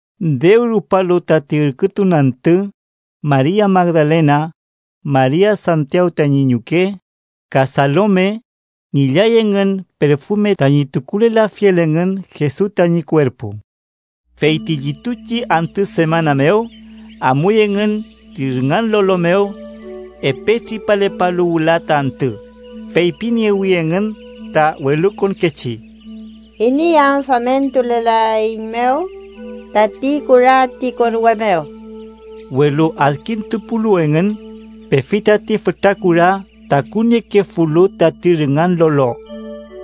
Dew rupalu tati ürkütun antü, Maria Magdalena, Maria Santiaw tañi ñuke, ka Salome, ngillay engün perfume tañi tukulelafiel engün Jesus tañi kuerpu. Fey ti llituchi antü semana mew, amuy engün ti rüngan lolo mew, epe tripalepalu wüla ta antü, feypiniewi engün ta welukonkechi: —¿Iney am famentulelaeiñmew tati kura ti konwe mew? Welu adkintupulu engün, pefi tati fütra kura takuniekefulu tati rüngan lolo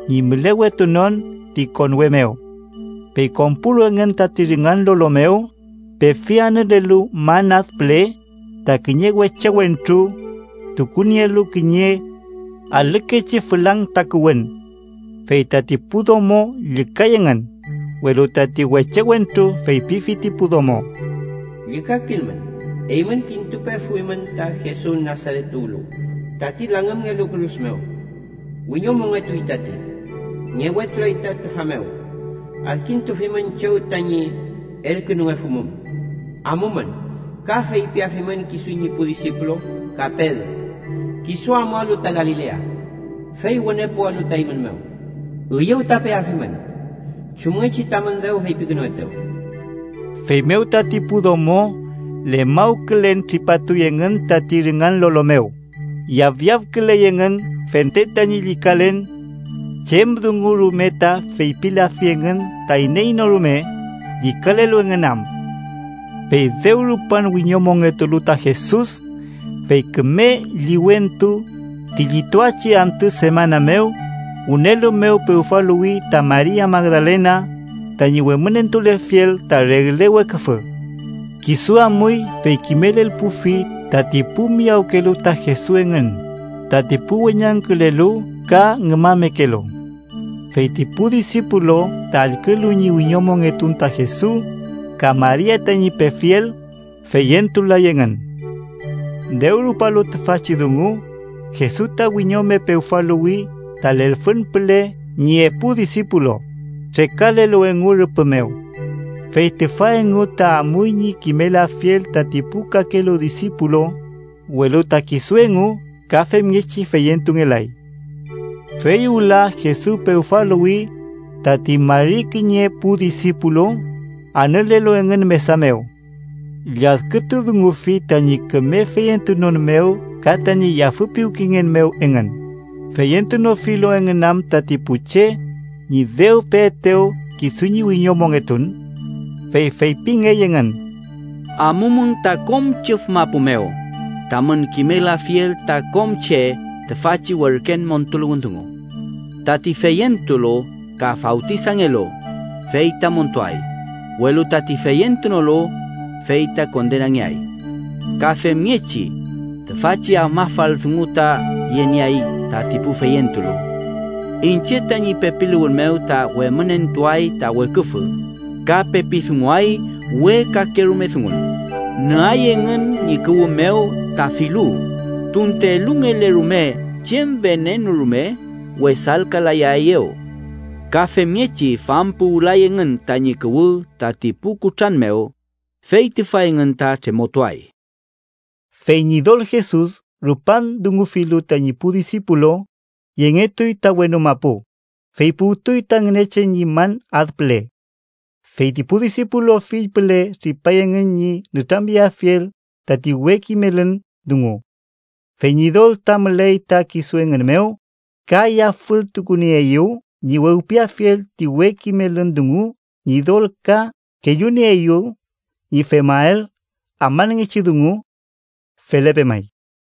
ñi mülewetunon ti konwe mew. Fey konpulu engün tati rüngan lolo mew, pefi, anülelu man ad püle, ta kiñe weche wentru tukunielu kiñe alükechi fülang takuwün. Fey tati pu domo llükay engün, welu tati weche wentru feypifi ti pu domo: —Llükakilmün. Eymün kintupefuymün ta Jesus Nasaret tuwlu, tati langümngelu kürus mew. Wiñomongetuy tati. Ngewetulay ta tüfa mew. Adkintufimün chew tañi elkünungefumum. Amumün ka feypiafimün kisu ñi pu disipulu, ka Pedro: ‘Kisu amualu ta Galilea, fey wüne puwalu ta eymün mew. Üyew ta peafimün, chumngechi tamün dew feypikünuetew.’ Feymew tati pu domo lefmawkülen tripatuy engün tati rüngan lolo mew, yafyafküley engün fente tañi llükalen. Chem dungu rume ta feypilafi engün ta iney no rume, llükalelu engün am. Fey dew rupan wiñomongetulu ta Jesus, fey küme liwentu ti llituachi antü semana mew, wünelu mew pewfaluwfi ta Maria Magdalena, tañi wemünentulelfiel ta regle weküfü. Kisu amuy fey kimelelpufi tati pu miyawkelu ta Jesus engün, tati pu weñangkülelu ka ngümamekelu. Fey ti pu disipulu ta allkülu ñi wiñomongetun ta Jesus ka Maria tañi pefiel, feyentulay engün. Dew rupalu tüfachi dungu, Jesus ta wiñome pewfaluwfi ta lelfün püle ñi epu disipulu, trekalelu engu rüpü mew. Fey tüfa engu ta amuy ñi kimelafiel tati pu kakelu disipulu, welu ta kisu engu ka femngechi feyentungelay. Fey wüla, Jesus pewfaluwfi tati mari kiñe pu disipulu, anülelu engün mesa mew. Lladkütudungufi tañi küme feyentunon mew ka tañi yafüpiwkengen mew engün, feyentunofilu engün am tati pu che ñi dew peetew kisu ñi wiñomongetun. Fey feypingey engün: —Amumün ta kom chüf mapu mew tamün kimelafiel ta kom che tüfachi werken montuluwün dungu. Tati feyentulu ka fawtisangelu, fey ta montuay, welu tati feyentunolu, fey ta kondenangeay. Ka femngechi tüfachi afmafal dungu ta yenieay tati pu feyentulu: iñche tañi pepiluwün mew ta wemünentuay ta weküfü, ka pepi dunguay we kakerume dungun, nüay engün ñi kuwü mew ta filu, tunte elungele rume chem venenu rume, wesalkalayaeyew. Ka femngechi fampuwülay engün tañi kuwü tati pu kutran mew, fey tüfa engün ta tremotuay. Fey Ñidol Jesus rupan dungufilu tañi pu disipulu, yengetuy ta wenu mapu, fey puwtuy ta Ngünechen ñi man ad püle. Fey ti pu disipulu fill püle tripay engün ñi nütramyeafiel tati we kimelün dungu, fey Ñidol ta müley ta kisu engün mew, ka yafültukunieeyew ñi wewpiafiel ti we kimelün dungu Ñidol ka kellunieeyew ñi femael afmanngechi dungu. Felepe may.